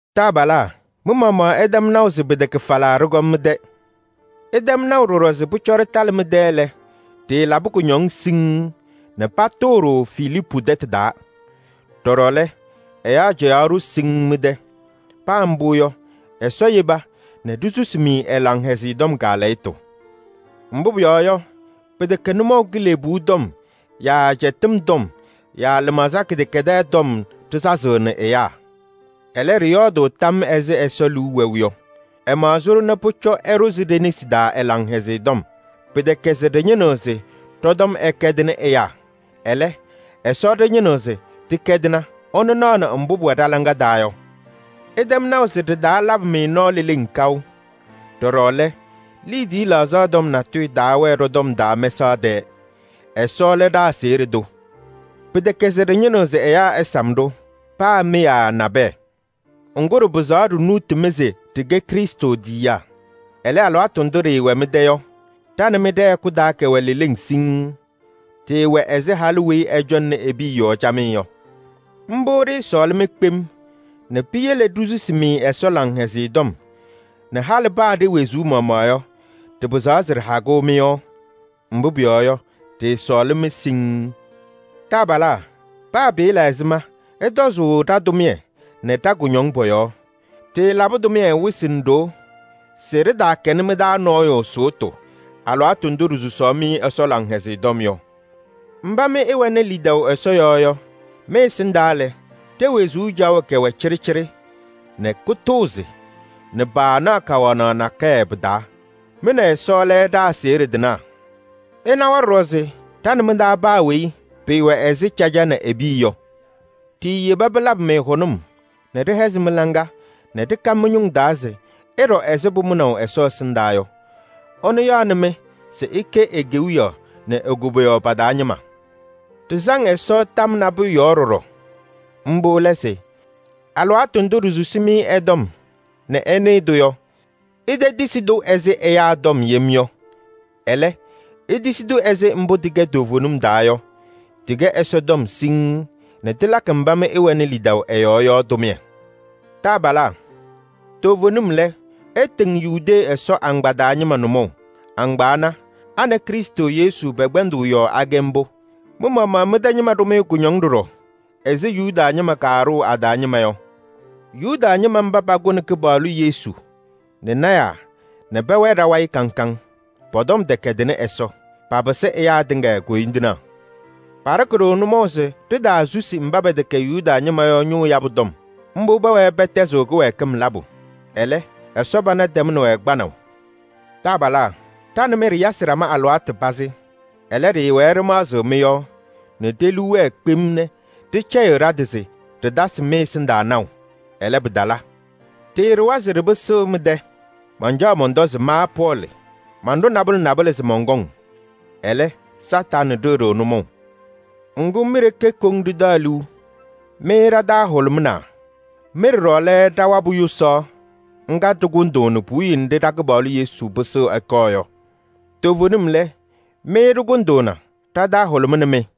Taabalaa! Mɩ-maɣmaɣ ɩtɛm naʋ se pɩtɛkɛ falaa ɖɩkɔm mɩ-tɛ. Ɩtɛm naʋ ɖɔɖɔ se pʋcɔ ɖɩtalɩ mɩ-tɛ lɛ, ɖɩɩlabɩ kʋñɔŋ siŋŋ nɛ patʋʋ-ɖʋ Filiipu tɛtʋ taa. Ɖɔɖɔ lɛ, ɛyaa cɛyaɣ-ɖʋ siŋŋ mɩ-tɛ. Paa mbʋ yɔ, Ɛsɔ yeba nɛ ɖisusi-mɩ ɛ-Laŋhɛzɩyɛ Tɔm kaalɛyɩtʋ. Mbʋ pʋyɔɔ yɔ, pɩtɛkɛ nʋmɔʋ kilebuu tɔm yaa ajiitu tɔm yaa lɩmaɣza kɩdɛkɛdɛɛ tɔm ɖɩsazɩɣnɩ ɛyaa. Ɛlɛ, ɖɩyɔɔdʋʋ tam ɛzɩ Ɛsɔ liu wɛʋ yɔ: ɛmaɣzɩ-ɖʋ nɛ pʋcɔ ɛɖʋzɩ ɖe-nesi taa ɛ-Laŋhɛzɩyɛ Tɔm. Pɩtɛkɛ se ɖɩñɩnɩɣ se ɖɔ-tɔm ɛkɛdɩnɩ ɛyaa, ɛlɛ, Ɛsɔ ɖɩñɩnɩɣ se tɩkɛdɩna, ɛnʋ naɣnɩ mbʋ pʋwɛ ɖa-laŋa taa yɔ. Ɩtɛm naʋ se ɖɩtaalabɩ-mɩ nɔɔ leleŋ kaʋ. Ɖɔɖɔ lɛ, liidiye laɣzaɣ tɔm natʋyʋ taawɛɛ ɖɔ-tɔm taa mɛsaɣ tɛɛ. Ɛsɔ lɛ ɖa-aseɣɖe tʋ. Pɩtɛkɛ se ɖɩñɩnɩɣ se ɛyaa ɛsam-ɖʋ: paa mɩ yaa nabɛyɛ. Ŋgʋ, ɖɩpɩzaɣ ɖinuuti-mɩ se ɖɩkɛ Krɩstʋ tiyiyaa. Ɛlɛ, alɩwaatʋ ndʋ ɖɩɩwɛ mɩ-tɛ yɔ, ɖa nɛ mɩ ɖɛ-hɛkʋ taa kɛwɛ leleŋ siŋŋ. Ɖɩɩwɛ ɛzɩ halʋ weyi ɛcɔŋnɩ e-piya yɔɔ camɩyɛ yɔ. Mbʋ ɖɩɩsɔɔlɩ-mɩ kpem nɛ piyele ɖisusi-mɩ Ɛsɔ Laŋhɛzɩyɛ Tɔm nɛ halɩ paa ɖe-wezuu maɣmaɣ yɔ, ɖɩpɩzaɣ se ɖɩha mɩ-yɔɔ. Mbʋ pʋyɔɔ yɔ, ɖɩɩsɔɔlɩ-mɩ siŋŋ. Taabalaa! Paa pɩɩla ɛzɩma ɩtɔzʋʋ ɖa-tʋmɩyɛ nɛ ɖa-kʋñɔŋ pɔ-yɔɔ: ɖɩɩlabɩ tʋmɩyɛ wɩsɩ nɛ ɖoo se ɖɩtaakɛnɩ mɩ-taa nɔɔyʋ sʋʋtʋ alɩwaatʋ ndʋ ɖisusaɣ-mɩ Ɛsɔ Laŋhɛzɩyɛ Tɔm yɔ. Mba mɩ ɩwɛnɩ lidaʋ Ɛsɔ yɔɔ yɔ, mɩ-ɛsɩndaa lɛ, ɖe-wezuu caɣʋ kɛwɛ cɩɖɩcɩɖɩ nɛ kʋtʋʋzɩ nɛ paanaɣ kawanaɣ nakɛyɛ pɩ-taa. Mɩ nɛ Ɛsɔ lɛ ɖa-aseɣɖe tɩnaa. Ɩnawa ɖɔɖɔ se ɖa nɛ mɩ-taa paa weyi pɩɩwɛ ɛzɩ caja nɛ e-piya yɔ. Ɖiiyeba pɩlabɩ-mɩ hʋnʋm nɛ ɖɩhɛzɩ mɩ-laŋa nɛ ɖɩka mɩ-ñʋŋ taa se ɩɖɔ ɛzɩ pʋmʋnaʋ Ɛsɔ ɛsɩndaa yɔ. Ɛnʋ yaɣnɩ-mɩ se ɩkɛ e-Kewiyaɣ nɛ e-koboyaɣ pa-taa ñɩma. Ɖɩsaŋ Ɛsɔ tam nabʋyʋ yɔɔ ɖɔɖɔ. Mbʋ lɛ se: alɩwaatʋ ndʋ ɖisusi-mɩ ɛ-tɔm nɛ ɩnɩɩ-tʋ yɔ, itetisi-tʋ ɛzɩ ɛyaa tɔm yem yɔ. Ɛlɛ, itisi-tʋ ɛzɩ mbʋ tɩkɛ toovenim taa yɔ, tɩkɛ Ɛsɔtɔm siŋŋ nɛ tɩlakɩ mba mɩ ɩwɛnɩ lidaʋ ɛ-yɔɔ yɔ tʋmɩyɛ. Taabalaa! Toovenim lɛ, ɩtɩŋ Yudee Ɛsɔ agbaa taa ñɩma nʋmɔʋ. A nɛ Krɩstʋ Yesu pɛ-kpɛndʋʋ yɔɔ akɛ mbʋ. Mɩ-maɣmaɣ mɩ-tɛ ñɩma ɖʋ-mɩ kʋñɔŋ ɖɔɖɔ ɛzɩ Yuda ñɩma kaaɖʋʋ a-taa ñɩma yɔ. Yuda ñɩma mba pakʋnɩ Kɩpaɣlʋ Yesu nɛ lɔɔyɩsɩ tɩnaa nɛ pɛwɛɛ ɖa-wayɩ kaŋ kaŋ. Pɔ-tɔm tɛkɛdɩnɩ Ɛsɔ, papɩsɩ ɛyaa tɩŋa koyindinaa. Paɖɩkɩ-ɖʋ nʋmɔʋ se ɖitaasusi mba pɛtɛkɛ Yuda ñɩma yɔ ñʋʋ yabʋ tɔm. Mbʋ pɛwɛɛ pɛtɛzɩɣ kɩwɛɛkɩm labʋ. Ɛlɛ, Ɛsɔ pana tɛmnɩ-wɛ kpanaʋ. Taabalaa! Ɖa nɛ mɩ ɖɩyasɩ ɖama alɩwaatʋ pazɩ. Ɛlɛ, ɖɩɩwɛɛ ɖɩmaɣzɩɣ mɩ-yɔɔ nɛ ɖe-liu wɛɛ kpem nɛ ɖɩcɛyɩ ɖa-tɩ se ɖɩtasɩ mɩ-ɛsɩndaa naʋ. Ɛlɛ, pɩtala. Ɖɩɩɖʋwa se ɖɩpɩsɩɣ mɩ-tɛ, mancaɣ mɔntɔ se ma Pɔɔlɩ, manɖʋ nabʋlɛ nabʋlɛ se mɔnkɔŋ, ɛlɛ, Kañadʋ Satanɩ ɖɩɣ-ɖʋ nʋmɔʋ. Ŋgʋ, mi-ɖeke koŋ ɖɩtaɣ liu, mɩ ɖa-taa hʋlʋmʋʋna. Mɩ ɖɔɖɔ lɛ ɖa-wabʋ yʋsaɣ ŋga ɖɩkʋndʋʋnɩ puwiye nɖɩ ɖa-Kɩpaɣlʋ Yesu pɩsɩɣ ɛkɔɔ yɔ. Toovenim lɛ, mɩ ɖɩkʋndʋʋna, ɖa-taa hʋlʋmɩnɩ-mɩ.